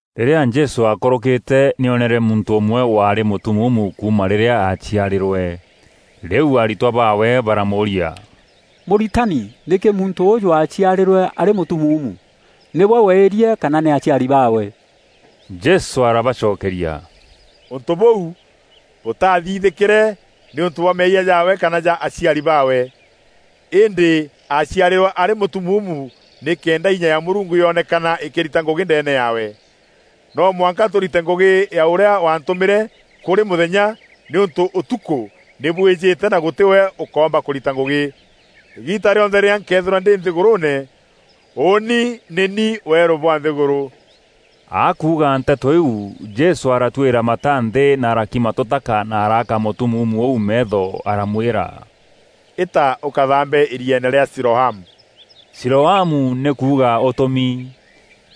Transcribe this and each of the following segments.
Rîrîa Jesû akûrûkîte, nî oonere muntû ûmwe waarî mûtumuumu kuuma rîrîa aaciarîrwe. Rîu aritwa baawe baramûûria, “Mûritani, nîkî muntû ûûjû aaciarîrwe arî mûtumuumu? Nîwe weîrie kana nî aciari baawe?” Jesû arabacokeria, “Ûntû bûu bûtaathithîkîre nîûntû bwa meeyia jaawe kana ja aciari baawe. Îndî aaciarîrwe arî mûtumuumu nîkenda inya ya Mûrungu yonekana îkîrita ngûgî ndeene yaawe. No mwanka tûrite ngûgî ya ûrîa waantûmîre kûrî mûthenya nîûntû ûtukû nî bwîjîte na gûtî we ûkoomba kûrita ngûgî. Îgiita rîonthe rîrîa nkeethîrwa ndî nthîgûrûûne, ûûni nî ni weerû bwa nthîgûrû.” Akuuga nteto iu, Jesû aratwîra mata nthî na arakima tûtaka na araaka mûtumuumu ûu meetho aramwîra, “Îta ûkathaambe îrieene rîa Siloamu.” (Siloamu nî kuuga “Ûtûmi”).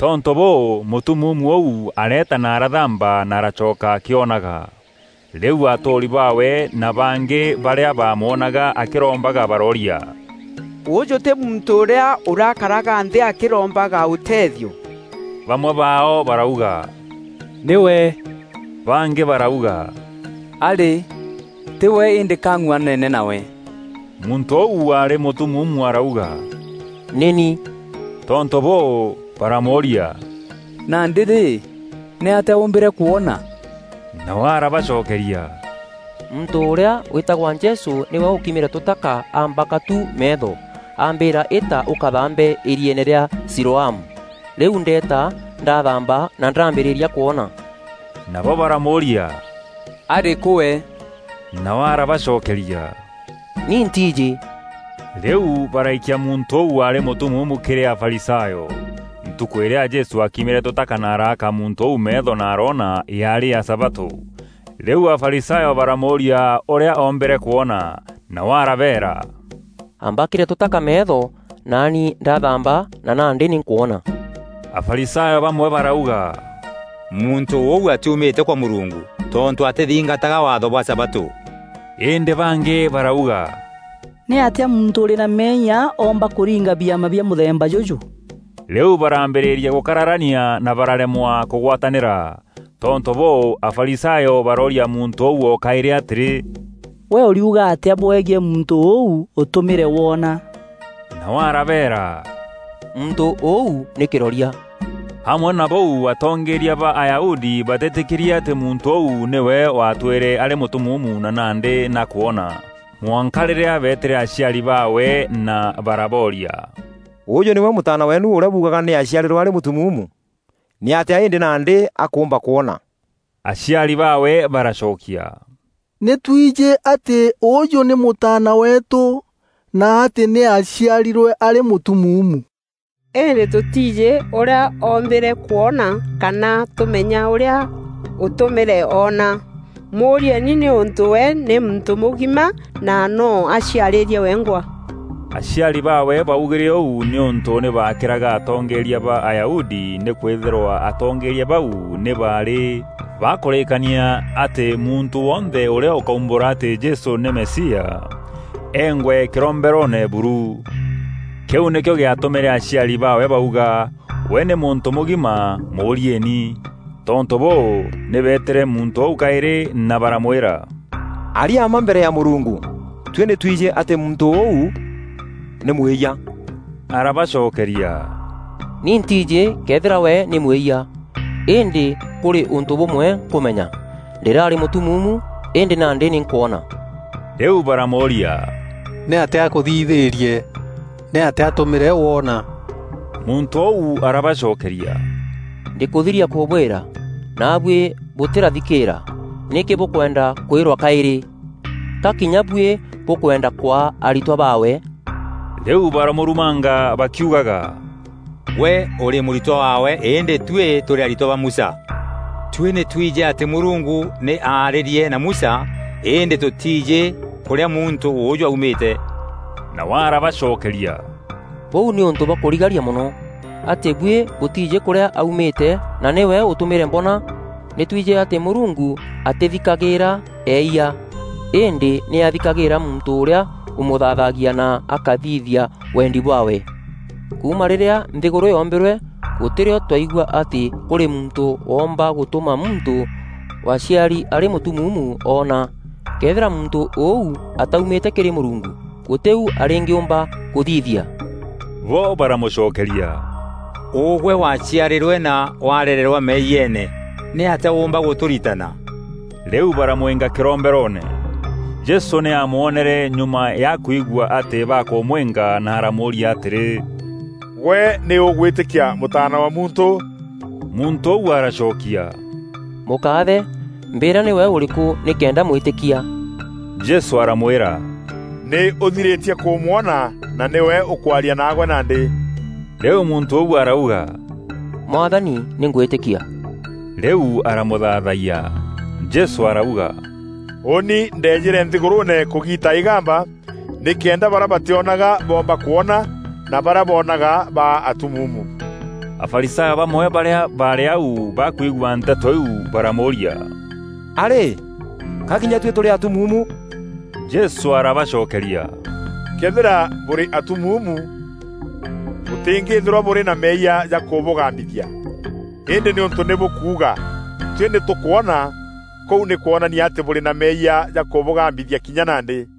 Tontû bûû, mûtumuumu ûu areeta na arathaamba na aracoka akîonaga. Rîu atûûri baawe na bangî barîa baamwonaga akîrombaga barooria, “Ûûjû tî muntû ûrîa ûrakaraga nthî akîrombaga ûtethio?” Bamwe baao barauga, “Nîwe!” Bangî barauga, “Arî, tî we îndî ka ang'uanene nawe.” Muntû ûu waarî mûtumuumu arauga, “Nî ni.” Tontû bûû, baramûûria, “Nandî rî, nîatîa ûûmbîre kwona?” Nawe arabacokeria, “Muntû ûrîa wîtagwa Jesû nîwe ûkimîre tûtaka aambaka tu meetho, aambîîra, ‘Îta ûkathaambe îrîeene rîa Siloamu.’ Rîu ndeeta, ndathaamba na ndaambîrîria kwona.” Nabo baramûûria, “Arîkû we?” Nawe arabacokeria, “Ni ntiijî.” Rîu baraikia muntû ûu waarî mûtumuumu kîrî Afarisayo. Ntukû îrîa Jesû aakimîre tûtaka na araaka muntû ûu meetho na aroona, yaarî ya sabatû. Rîu Afarisayo baramûûria ûrîa oombîre kwona. Nawe aarabeera, “Ambakîre tûtaka meetho, naani ndathaamba na nandî nî nkwona.” Afarisayo bamwe barauga, “Muntû ûu atiumîte kwa Mûrungu, tontû atîthingataga waatho bwa sabatû.” Îndî bangî barauga, “Nîatîa muntû ûrî na meeyia oomba kûringa biama bia mûthemba jûjû?” Rîu barambîrîria gûkararania na bararemwa kûgwatanîra. Tontû bûû, Afarisayo barooria muntû ûu o kaîrî atîrî, “Gwe ûriuga atîa bwegiî muntû ûu ûtûmîre woona?” Nawe arabeera, “Muntû ûu nî kîroria.” Amwe na bûu atongeeria ba Ayahudi bateetîkîrie atî muntû ûu nîwe waatwîre arî mûtumuumu na nandî nî akwona, mwanka rîrîa beetîre aciari baawe na barabooria, “Ûûjû nîwe mûtaana weenu ûrîa buugaga nî aaciarîrwe arî mûtumuumu? Nîatîa îndî nandî akûûmba kwona?” Aciari baawe baracokia, “Nî twijî atî ûûjû nî mûtaana weetû, na atî nî aaciarîrwe arî mûtumuumu. Îndî tûtiijî ûrîa oombîre kwona kana tûmenya ûrîa ûtûmîre oona. Mûûrieeni nîûntû we nî muntû mûgima na noo aciarîîrie wengwa.” Aciari baawe baugîre ûu nîûntû nî baakîraga atongeeria ba Ayahudi nîkwîthîrwa atongeeria bau nî baarî bakûrîîkania atî muntû wonthe ûrîa ûkaumbûra atî Jesû nî Mesia, eengwe kîromberoone buru. Kîu nîkîo gîatûmîre aciari baawe bauga: “We nî muntû mûgima, mûûrieeni.” Tontû bûû, nî beetîre muntû ûu kaîrî na baramwîra, “Aria mma mbere ya Mûrungu! Tuî nî twijî atî muntû ûu nî mwîyia.” Arabacokeria, “Ni ntiijî këethîra we nî mwîyia. Îndî kûrî ûntû bûmwe nkûmenya: ndîraarî mûtumuumu, îndî nandî nî nkwona.” Rîu baramûûria, “Nîatîa akûthithîîrie? Nîatîa atûmîre woona?” Muntû ûu arabacokeria, “Ndîkûthiria kûbwîra, naabuî bûtîrathikîîra. Nîkî bûkwenda kwîrwa kaîrî? Ka kinya buî bûkwenda kwaa aritwa baawe?” Rîu baramûrumanga bakiugaga, “Gwe ûrî mûritwa waawe îndî tuî tûrî aritwa ba Musa. Tuî nî twijî atî Mûrungu nî aarîrie na Musa îndî tûtîîjî kûrîa muntû ûûjû aumîte.” Nawe arabacokeria, “Bûu nî ûntû bwa kûrigaria mono! Atî buî bûtiijî kûrîa aumîte na nîwe ûtûmîre mboona! Nî twijî atî Mûrungu atîthikagîîra eeyia, îndî nî athikagîîra muntû ûrîa ûmûthaathagia na akathithia wendi bwaawe. Kuuma rîrîa nthîgûrû yoombîrwe, gûtî rîo twaigua atî kûrî muntû woomba gûtûma muntû waaciari arî mûtumuumu oona. Këethîra muntû ûu ataumîte kîrî Mûrungu, gûtî u arîngîûmba kûthithia.” Bo baramûcokeria, “Ûgwe waaciarîrwe na warererwa meeyiene, nîatîa ûûmba gûtûritana?” Rîu baramwînga kîromberoone. Jesû nî aamwonere nyuma ya akwigua atî bakûmwînga na aramûûria atîrî, “Gwe nî ûgwîtîkia Mûtaana wa Muntû?” Muntû ûu aracokia, “Mûkaathe, mbîîra nîwe ûrîkû nîkenda mwîtîkia.” Jesû aramwîra, “Nî ûthirîtie kûmwona, na nîwe ûkwaria naagwe nandî.” Rîu muntû ûu arauga, “Mwathani, nî ngwîtîkia!” Rîu aramûthaathayia. Jesû arauga, “Ûûni ndeejîre nthîgûrûûne kûgiita îgamba, nîkenda barîa batîonaga boomba kwona, na barîa boonaga baa atumuumu.” Afarisayo bamwe barîa baarî au bakwigua nteto iu baramûûria, “A rî, ka kinya tuî tûrî atumuumu?” Jesû arabacokeria, “Këethîra bûrî atumuumu, bûtîngîîthîrwa bûrî na meeyia jakûbûgambithia. Îndî nîûntû nî bûkuuga: ‘Tuî nî tûkwona,’ kûu nî kwonania atî bûrî na meeyia jakûbûgambithia kinya nandî.”